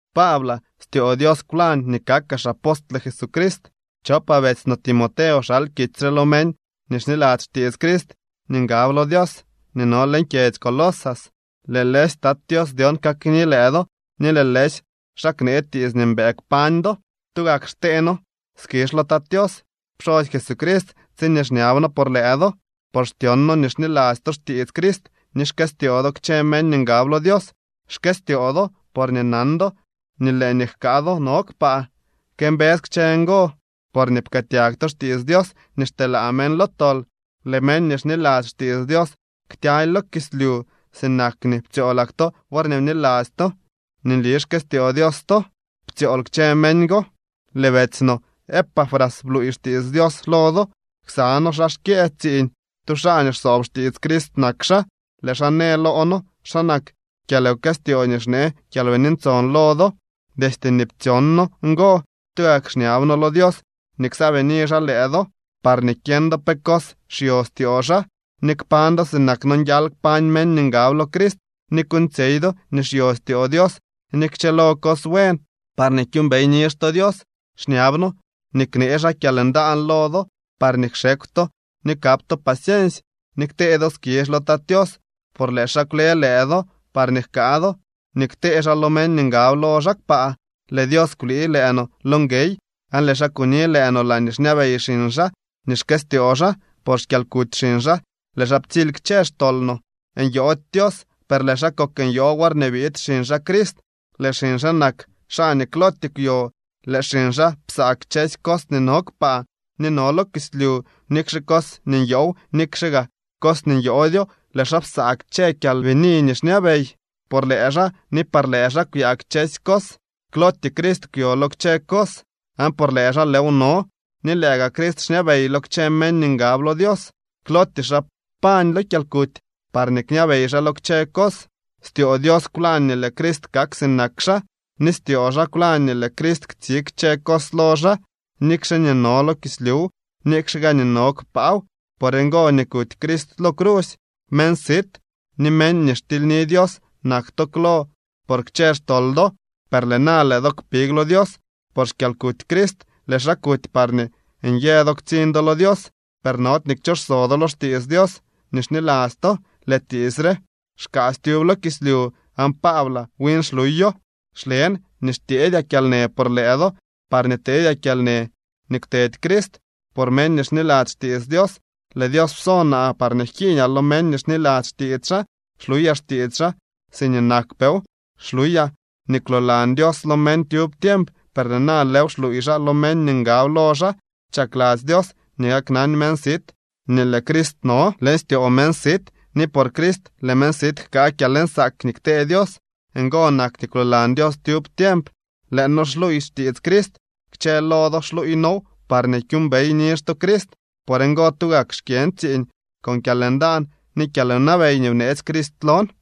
Paablaa, styoo Dios kwlañ nii kakaa xapostle Jesucrist. Chopaa betsy no Timoteo xal kitsy re lo meñ nii xniladzy xtiits Crist ni ngab lo Dios nii no leñ kyedzy Colosas. Lëë lëësy Tat Tios dyon kakni lëë do ni lëë lëësy xaa knee tiits nii mbëë kpañ do. Tugak xtee noo skizh lo Tat Tios pxosy Jesucrist tsiñee xñab noo por lëë do. Por xtsyon noo nii xniladzy to xtiits Crist ni xkëstyoo do kchë meñ nii ngab lo Dios. Xkëstyoo do porñee nan do nii lëë nii jkaa do no kpaa. Këmbës kchë ngo porñee pkëëtyag to xtiits Dios nii xteelaa meñ lo tol. Lëë meñ nii xniladzy xtiits Dios ktyaly lo kislyu. Sinak nii ptsyoolak to worñee bniladzy to nii nli xkëstyoo Dios to ptsyool kchë meñ go. Lëë betsy noo Epafras bluuy xtiits Dios lo do. Ksa noo xaa xkyë tsiiñ. Tu xaa nii xsoob xtiits Crist nak xaa. Lëë xaa në loo noo xa nak kyalwkëstyoo nii xnee Kyalbini Ntson lo do. Destye nii ptsyon noo ngo, tugak xñab noo lo Dios nii ksaabini xaa lëë do parñee kyeñ do pe cos xyo styoo xaa, ni kpañ do sinak nonguial kpañ meñ nii ngab lo Crist, ni kuuñtsyey do nii xyo styoo Dios ni kchëlo cos buen parñee kyuumbey nizh to Dios. Xñab noo nii knee xaa kyalndaan lo do parñee kxekw to ni kap to paciensy, ni ktee do skizh lo Tat Tios, por lëë xaa kwle lëë do parñee jkaa do nii ktee xaa lo meñ nii ngab lo xaa kpaa. Lëë Dios kwlii lëë no lo nguey, aan lëë xaa kuni lëë no laañee xñabey xiñ xaa nii xkëstyoo xaa. Por xkyalkuty xiñ xaa, lëë xaa ptsily kchë xtol no. Nyoody Dios, per lëë xaa kok nyoo worñee biid xiñ xaa Crist. Lëë xiñ xaa nak xaa nii klootyee kwyo. Lëë xiñ xaa psaa kchësy cos nii no kpaa ni no lo kislyu, nikxe cos nii nyoow, nikxe gaa cos nii nyoodyo. Lëë xaa psaa kchë kyalbini nii xñabey. Por lëë xaa ni par lëë xaa kwyaa kchësy cos. Klootyee Crist kwyo lo kchë cos, aan por lëë xaa lëëw no. Ni lëë gaa Crist xñabey lo kchë meñ nii ngab lo Dios. Klootyee xaa pañ lo kyalkuty parñee kñabey xaa lo kchë cos. Styoo Dios kwlañ nii lëë Crist kak sinak xaa, ni styoo xaa kwlañ nii lëë Crist ktsig kchë cos lo xaa, nikxe nii no lo kislyuw, nikxe gaa nii no kpaaw. Por ngo nii kuty Crist lo crusy. Meñ sit ni meñ nii xtilyni Dios nak to klo por kchë xtol do, per lëë na lëë do big lo Dios por xkyalkuty Crist. Lëë xaa kuty parñee nyë do ktsiñ do lo Dios. Per nody nii kchooxso do lo xtiits Dios nii xniladzy to. Lëë tiits re xkaasy tyub lo kislyu, aan Paablaa win xluyo. Xlen nii xtyeedyaa kyalnë por lëë do, parñee tedyaa kyalnë nii kwtedy Crist por meñ nii xniladzy xtiits Dios. Lëë Dios pso naa parñee jkiiñaa lo meñ nii xniladzy xtiits xaa. Xluyaa xtiits xaa siñee nakpeew. Xluyaa nii kwloolan Dios lo meñ tyub tiemp, per lëë na lëëw xluuy xaa lo meñ nii ngab lo xaa. Chakladzy Dios nii kaknan meñ sit nii lëë Crist no leñ styoo meñ sit, ni por Crist lëë meñ sit jkaa kyalnsaak nii ktee Dios. Ngo nak nii kwloolan Dios tyub tiemp. Lëë noo xluuy xtiits Crist. Kchë lo do xluuy noow parñee kyuumbey nizh to Crist. Por ngo, tugak xkyën tsiiñ con kyalndaan ni kyalwnabey nii bneetsy Crist lon.